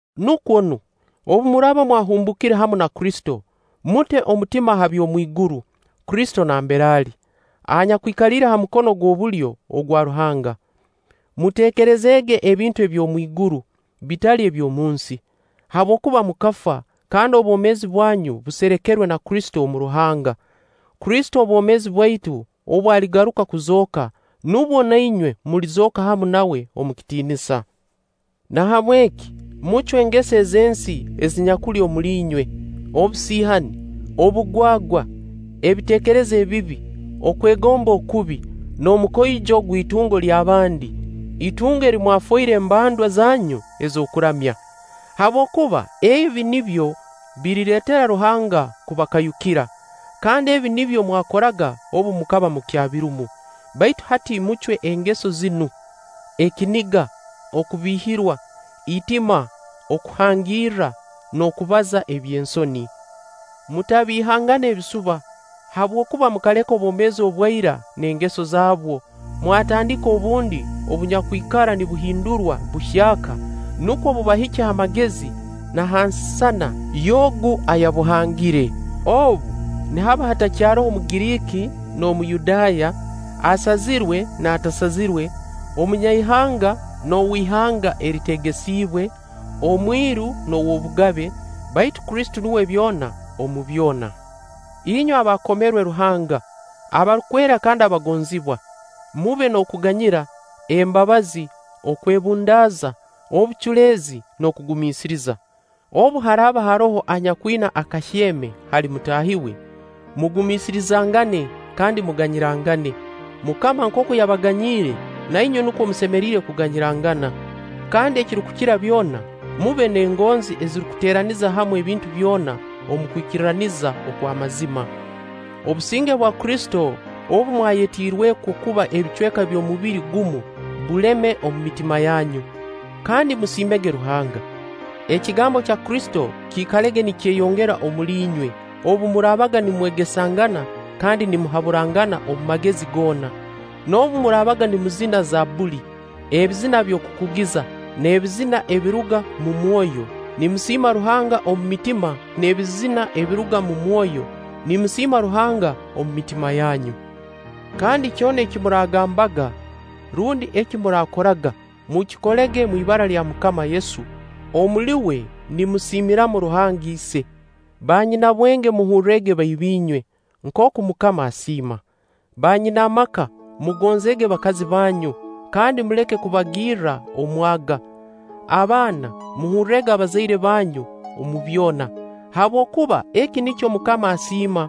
Nukwo nu, obu muraaba mwahumbuukire hamu na Kristo, mute omutima ha by'omwiguru, Kristo nambere ali, anyakwikaliire ha mukono gw'obulyo ogwa Ruhanga. Muteekerezeege ebintu eby'omwiguru, bitali eby'omunsi. Habwokuba mukafa, kandi obwomeezi bwanyu buserekerwe na Kristo omu Ruhanga. Kristo obwomeezi bwaitu obu aligaruka kuzooka, nubwo na inywe mulizooka hamu nawe omu kitiinisa. Nahabweki mucwe engeso ez'ensi ezinyakuli omuli inywe: obusiihani, obugwagwa, ebiteekerezo ebibi, okwegomba okubi, n'omukoijo gw'itungo ly'abandi, itungo eri mwafoire embandwa zanyu ez'okuramya. Habwokuba ebi nibyo birireetera Ruhanga kubakayukira. Kandi ebi nibyo mwakoraga obu mukaba mukyabirumu. Baitu hati mucwe engeso zinu: ekiniga, okubiihirwa, itima okuhangirra, n'okubaza eby'ensoni. Mutabiihangana ebisuba, habwokuba mukaleka obwomeezi obwa ira n'engeso zaabwo, mwatandika obundi obunyakwikara nibuhindurwa buhyaka nukwo bubahikye ha magezi na ha nsisana by'Ogu ayabuhangire. Obu, nihaba hatakyaroho Omugiriiki n'Omuyudaaya, asazirwe n'atasazirwe, omunyaihanga n'ow'ihanga eriteegesibwe, omwiru n'ow'obugabe, baitu Kristo nuwe byona omu byona. Inywe abaakomerwe Ruhanga, abarukwera kandi abagonzibwa, mube n'okuganyira, embabazi, okwebundaaza, obuculeezi, n'okugumiisiriza. Obu haraaba haroho anyakwina akahyeme hali mutaahi we, mugumiisirizangane kandi muganyirangane. MUKAMA nkooku yabaganyiire, na inywe nukwo musemeriire kuganyirangana. Kandi ekirukukira byona, mube n'engonzi eziteeraniza hamu ebintu byona omu kwikirraniza okw'amazima. Obusinge bwa Kristo obu mwayetiirwekwo kuba ebicweka by'omubiri gumu buleme omu mitima yanyu. Kandi musiimege Ruhanga. Ekigambo kya Kristo kiikalege nikyeyongera omuli inywe, obu muraabaga nimwegesangana kandi nimuhaburangana omu magezi goona, noobu muraabaga nimuzina zabbuli, ebizina by'okukugiza, n'ebizina ebiruga mu mwoyo, nimusiima Ruhanga omu mitima n'ebizina ebiruga mu mwoyo, nimusiima Ruhanga omu mitima yanyu. Kandi kyona eki muraagambaga rundi eki muraakoraga, mukikolege omu ibara lya MUKAMA Yesu, omuli uwe nimusiimiramu Ruhanga Ise. Banyinabwenge muhurrege baiba-inywe nkooku MUKAMA asiima. Banyinaamaka mugonzeege bakazi banyu kandi muleke kubagirra omwaga. Abaana muhurrege bazaire banyu omu byona, habwokuba eki nikyo MUKAMA asiima.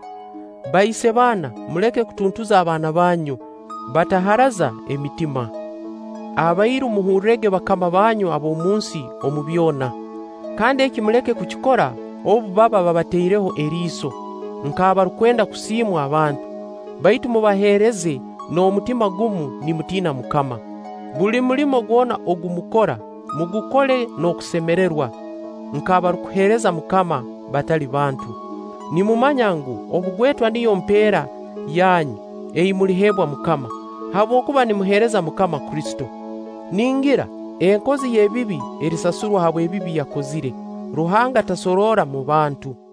Baise-baana muleke kutuntuza abaana banyu, bataharaza emitima. Abairu muhurrege bakama banyu ab'omunsi omu byona. Kandi eki muleke kukikora obu baba babataireho eriiso, nk'abarukwenda kusiimwa abantu; baitu mubaheereze n'omutima gumu nimutiina MUKAMA. Buli mulimo gwona ogu mukora, mugukole n'okusemererwa, nk'abarukuheereza MUKAMA batali bantu. Nimumanya ngu, obugwetwa niyo mpeera yanyu ei muliheebwa MUKAMA; habwokuba nimuheereza MUKAMA Kristo. Ningira enkozi y'ebibi erisasurwa habw'ebibi yakozire. Ruhanga tasoroora mu bantu.